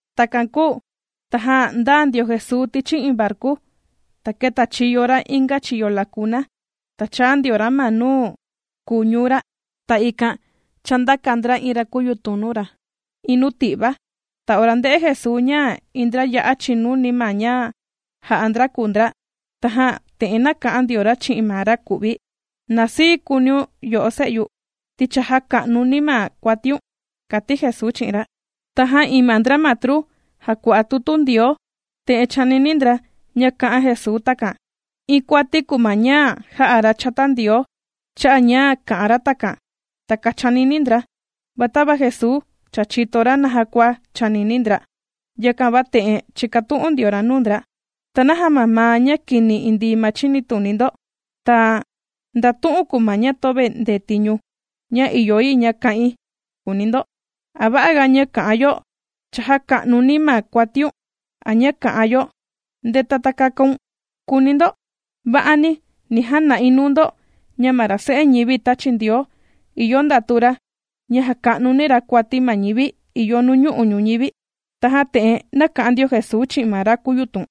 Takan kūu tajan ndāa ndio Jesuu tichi iin varku, ta kētachiyo ra inga chiyo lakuna, ta chāa ndio ra ma nuu kùu ñuu ra. Ta ikan chāndaka ndra iin ra kūyutun nuu ra iin nuu ti'va. Ta ora ndē'e Jesuu ña iin ndra ya'a chìnuni ma ña jà'a ndra kùu ndra, tajan te'en nāka'an ndio ra chi'in ma ra ku'vi: ―Na sii kuuniun yo'o se'yu, ti cha jāka'nuni̱ ma kuatiun, ―kàti Jesuu chi'in ra. Tajan iin ma ndra matru jàkua'a tutu Ndioo, te'en chānini ndra ña kā'an Jesuu takan: “Iin kuati kùu ma ña jà'a ra chata Ndioo, cha'a' ña kā'an ra takan.” Takan chānini ndra. Va tava Jesuu cha chìto ra naja kua chànini ndra, yakan va te'en chīkatu'un ndio ra nuu ndra: ―¿Ta naja mamaa ña kini indii ma chinituni ndo? Ta, ¿nda tu'un kùu ma ña töve ndetiñu ña ìyo yi ña kà'in?, kùuni ndo. ¿A va'aga ña ka'an yo: “Cha jaka'nuni̱ ma kuatiun”, a ña kā'an yo: “Ndeta, ta kakaun”?, kùuni ndo. Va'ani, ni jana'i nuu ndo ña ma ra Se'e ñivi tāchi Ndioo, ìyo ndatu ra ña jaka'nuni ra kuati ma ñivi ìyo nuñu'u' ñuñivi. Tajan te'en nāka'an ndio Jesuu chi'in ma ra kūyutun: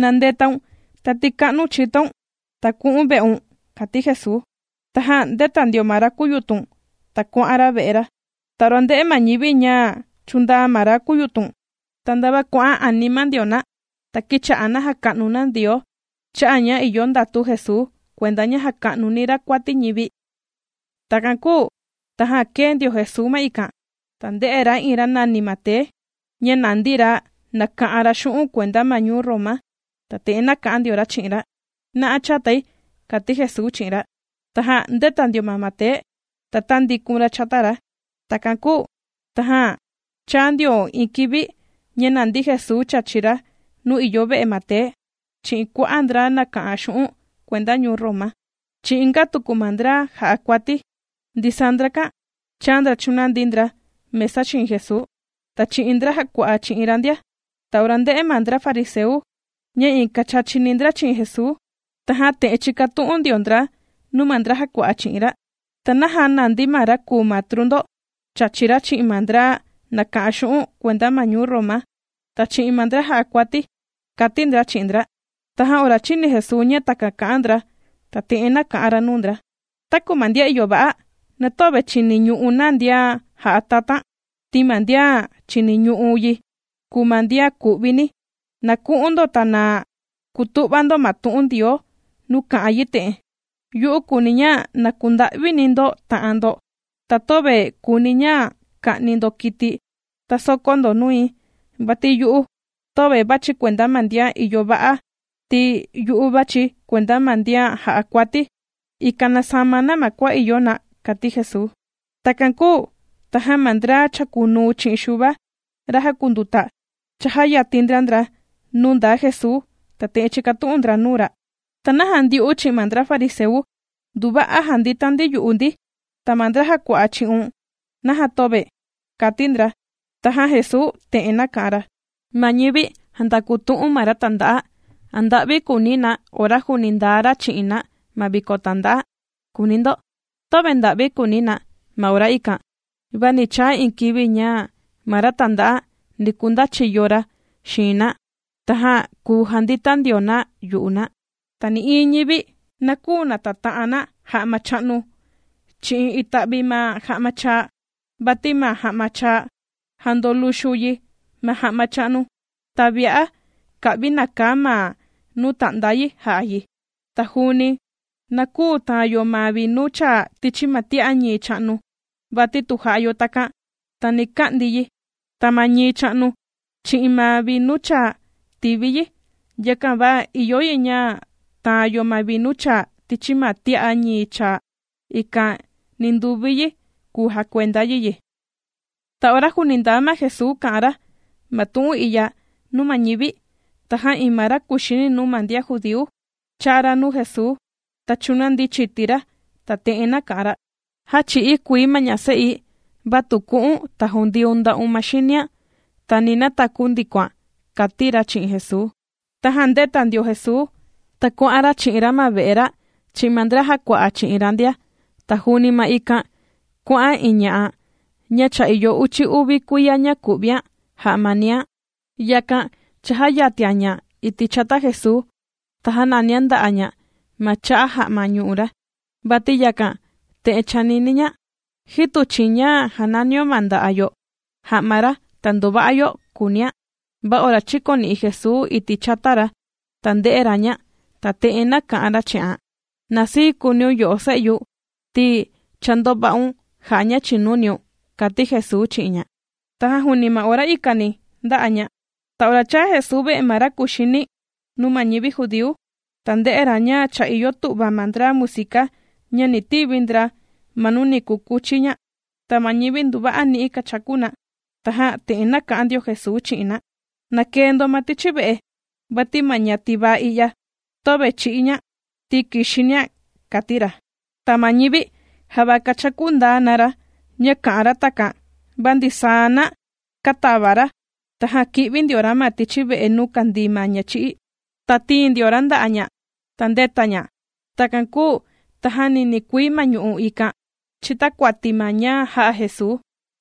―Na ndetaun, ta tika'nu̱n chitoun, ta ku'u̱n ve'un ―kàti Jesuu. Tajan ndēta ndio ma ra kūyutun, ta kuà'an ra ve'e ra. Ta ora ndē'e ma ñivi ña chūndaa ma ra kūyutun, ta ndava kuà'an anima ndio na, ta kīcha'a na jàka'nu na Ndioo cha'a' ña ìyo ndatu Jesuu kuenda ña jaka'nuni ra kuati ñivi. Takan kūu tajan kēe ndio Jesuu ma ikan, ta ndē'e ra iin ra nàni Mate ña nàndi ra nàka'an ra xu'un' kuenda ma ñuu Roma. Ta te'en nāka'an ndio ra chi'in ra: ―Na'a chatai ―kàti Jesuu chi'in ra. Tajan ndēta ndio ma Mate, ta tāndikun ra chata ra. Takan kūu tajan chāa ndio iin kivi ña nàndi Jesuu chàchi ra nuu ìyo ve'e Mate chi'in kua'a' ndra nàka'an xu'un' kuenda ñuu Roma, chi'in inga tuku ma ndra jà'a kuati. Ndisaa ndrakan chāa ndra chūnandi ndra mesa xiin Jesuu, ta chi'in ndra jàkua'a chi'in ra ndia. Ta ora ndē'e ma ndra fariseu ña iin kàchachini ndra chi'in Jesuu, tajan te'en chīkatu'un ndio ndra nuu ma ndra jàkua'a chi'in ra: ―¿Ta naja nàndi ma ra kùu matru ndo chàchi ra chi'in ma ndra nàka'an xu'un' kuenda ma ñuu Roma, ta chi'in ma ndra jà'a kuati? ―kàti ndra chi'in ndra. Tajan ora chīni Jesuu ña takan kà'an ndra, ta te'en nāka'an ra nuu ndra: ―Taku ma ndian ìyo va'a, na töve chìniñu'u na ndian jà'a tatan, ti ma ndian chìniñu'u yi kùu ma ndian ku'vini. Na ku'un ndo, ta na kutu'va ndo ma tu'un Ndioo nuu kà'an yi te'en: “Yu'u kùuni̱ ña na kunda'vini ndo ta'an ndo, ta töve kuuni̱ ña ka'ni ndo kiti, ta sòkó ndo nui.” Vati yu'u töve vàchi̱ kuenda ma ndian ìyo va'a, ti yu'u vàchi̱ kuenda ma ndian jà'a kuati, ikan na sama na ma kua ìyo na ―kàti Jesuu. Takan kūu tajan ma ndra chàkunuu chi'in Xuva, ra jàkunduta, chajāyatin ndra ndra nuu ndaa Jesuu, ta te'en chīkatu'un ndra nuu ra: ―¿Ta naja ndyu'u chi'in ma ndra fariseu, nduva'a jàndita ndi yu'u ndi? Ta ma ndra jàkua'a chi'un, ¿naja töve? ―kàti ndra. Tajan Jesuu te'en nāka'an ra: ―Ma ñivi jàndakutu'un ma ra tanda'a, ¿a nda'vi kùuni na ora juuni ndaa ra chi'in na ma viko tànda'a?, kùuni ndo. Töve nda'vi kùuni na ma ora ikan. Va ni chaa iin kivi ña ma ra tànda'a ni kundachiyo ra xiin na, tajan kùu jandita ndio na yu'u na. ’Ta nï'iin ñivi na küu nataa ta'an na ja'ma cha'nu chi'in ita'vi ma ja'ma chaa, vati ma ja'ma chaa, jandoluxu yi ma ja'ma cha'nu, ta vi'a ka'vi nàkaa ma nuu ta'nda yi ja'a yi. Ta juuni na küu tàan yo ma vinu chaa tichi ma tia'a ñii cha'nu, vati tu jà'a yo takan, ta ni ka'ndi yi, ta ma ñii cha'nu, chi'in ma vinu chaa tīvi yi. Yakan va ìyo yi ña taan yo ma vinu chaa tichi ma tia'a ñii chaa, ikan ninduvi yi kùu jakuenda yi yi. Ta ora juuni ndaa Jesuu kà'an ra ma tu'un i'ya nuu ma ñivi, tajan iin ma ra kùxini nuu ma ndian judíu, chāa ra nuu Jesuu, ta chūnandi chiti ra, ta te'en nāka'an ra: ―Já chī'í kuii ma ña se'i, va tu ku'u̱n, ta jundiun nda'un ma xinian, ta ni nataku ndikoan ―kàti ra chi'in Jesuu. Tajan ndēta ndio Jesuu, ta kuà'an ra chi'in ra ma ve'e ra chi'in ma ndra jàkua'a chi'in ra ndia. Ta juuni ma ikan kuà'an iin ña'a, ña cha ìyo uchi uvi kuiya ña kù'vian jà'a ma niian. Yakan chājayatian ña iti' chata Jesuu, ta jānanian nda'a' ña ma cha'a ja'ma ñu'u ra. Vati yakan, te'en chānini ña: “Jitu chi'in ña jananinio ma nda'a' yo ja'ma ra, ta ndova'a yo”, kùunian. Va ora chīkoni'i Jesuu iti' chata ra, ta ndē'e ra ña, ta te'en nāka'an ra chi'an: ―Na sii kuuniun yo'o se'yu ti cha ndova'un jà'a ña chìnuniun ―kàti Jesuu chi'in ña. Tajan juuni ma ora ikani ndā'a ña. Ta ora chāa Jesuu ve'e ma ra kùxini nuu ma ñivi judíu, ta ndē'e ra ña cha ìyo tu'va ma ndra musika ña ni tivi ndra ma nuu ni kukuchi ña. Ta ma ñivi nduva'a ni'i kachaku na. Tajan te'en nāka'an ndio Jesuu chi'in na: ―Na kee ndo ma tichi ve'e, vati ma ña tivaa i'ya, töve chī'í ña, ti kìxinian ―kàti ra. Ta ma ñivi java kāchakú ndaa na ra, ña kā'an ra takan. Va ndisaa na kātava ra, tajan kī'vi ndio ra ma tichi ve'e nuu kandii ma ña chī'í, ta tīin ndio ra nda'a' ña, ta ndēta ña. Takan kūu tajan ninii kuii ma ñu'u' ikan chìtakuati ma ña jā'a Jesuu.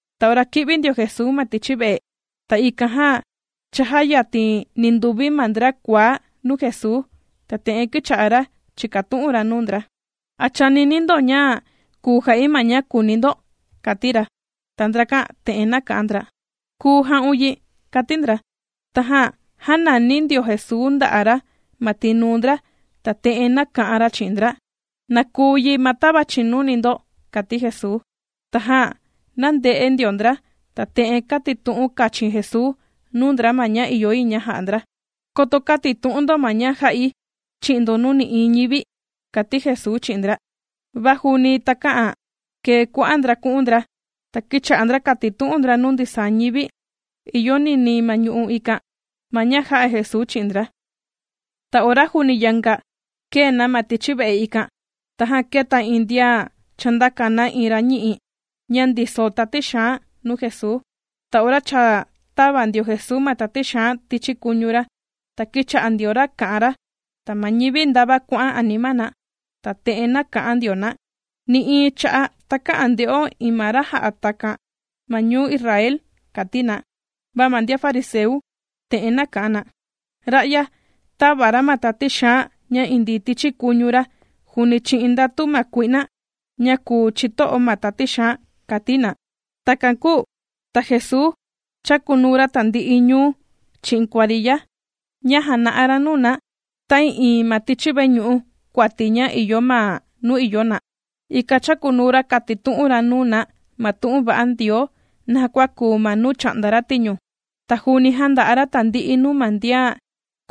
Ta ora kī'vi ndio Jesuu ma tichi ve'e, ta ikan jan chājayatin ninduvi ma ndra kuaá nuu Jesuu, ta te'en kīcha'a ra chìkatu'un ra nuu ndra: ―¿A chànini ndo ña kùu ja'i ma ña kùuni ndo? ―kàti ra. Ta ndrakan te'en nāka'an ndra: ―Kùu ja'un yi ―kàti ndra. Tajan jānani ndio Jesuu nda'a' ra ma tinuu ndra, ta te'en nāka'an ra chi'in ndra: ―¡Na kuu yi ma tava chìnuni ndo! ―kàti Jesuu. Tajan nānde'e ndio ndra. Ta te'en kātitu'un kachin Jesuu nuu ndra ma ña ìyo yi ña ja'a ndra: ―Koto kätitu'un ndo ma ña jā'i chi'in ndo nuu nï'iin ñivi ―kàti Jesuu chi'in ndra. Va juuni takä'an kee kua'a' ndra ku'un ndra, ta kīcha'a ndra kàtitu'un ndra nuu ndisaa ñivi ìyo ninii ma ñu'u' ikan, ma ña jā'a Jesuu chi'in ndra. Ta ora juuni yanga kèe na ma tichi ve'e ikan, tajan kēta iin ndian chāndaka na iin ra ñi'i ña ndiso tati xaan nuu Jesuu. Ta ora cha tāva ndio Jesuu ma tati xaan tichi kuñu ra, ta kīcha'a ndio ra kà'an ra. Ta ma ñivi ndava kuà'an anima na, ta te'en nāka'an ndio na: ―¡Nï'iin cha'a' takä'an nde'o iin ma ra jà'a takan ma ñuu Israel! ―kàti na. Va ma ndian fariseu te'en kà'an na: ―Ra'ya tàva ra ma tati xaan ña indii tichi kuñu ra juuni chi'in ndatu ma kui'na, ña kùu chito'o ma tati xaan ―kàti na. Takan kūu ta Jesuu chàkunuu ra tandi'i ñuu, chi'in kuariya, ña jàna'a ra nuu na, ta'ii'iin ma tichi veñu'u kuati ña ìyo ma nuu ìyo na. Ikan chàkunuu ra kàtitu'un ra nuu na ma tu'un va'a Ndioo naja kua kuu ma nuu chà'nda ra tiñu. Ta juuni jànda'a ra tandi'i nuu ma ndian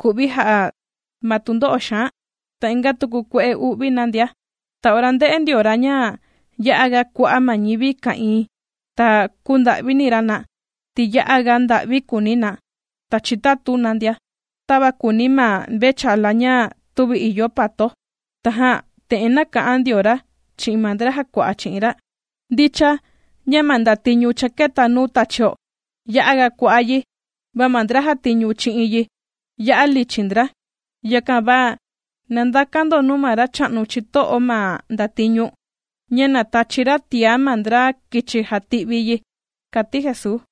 ku'vi jà'a ma tundo'o xaan, ta inga tuku kue'e u'vi na ndia. Ta ora ndē'e ndio ra ña ya'a ga kua'a' ma ñivi ka'ìin, ta kūnda'vini ra na, ti ya'a ga nda'vi kùuni na, ta chitatu na ndia, tava kùuni ma mvechala ña tüvi ìyo pato. Tajan te'en nāka'an ndio ra chi'in ma ndra jàkua'a chi'in ra: ―Ndicha ña ma ndatiñu cha kēta nuu tachio ya'a ga kua'a' yi, va ma ndra jàtiñu chi'in yi ya'a lichin ndra. Yakan va na ndakan ndo nuu ma Racha'nu chito'o ma ndatiñu, ña na tachi ra tiá ma ndra kichi jàti'vi yi ―kàti Jesuu.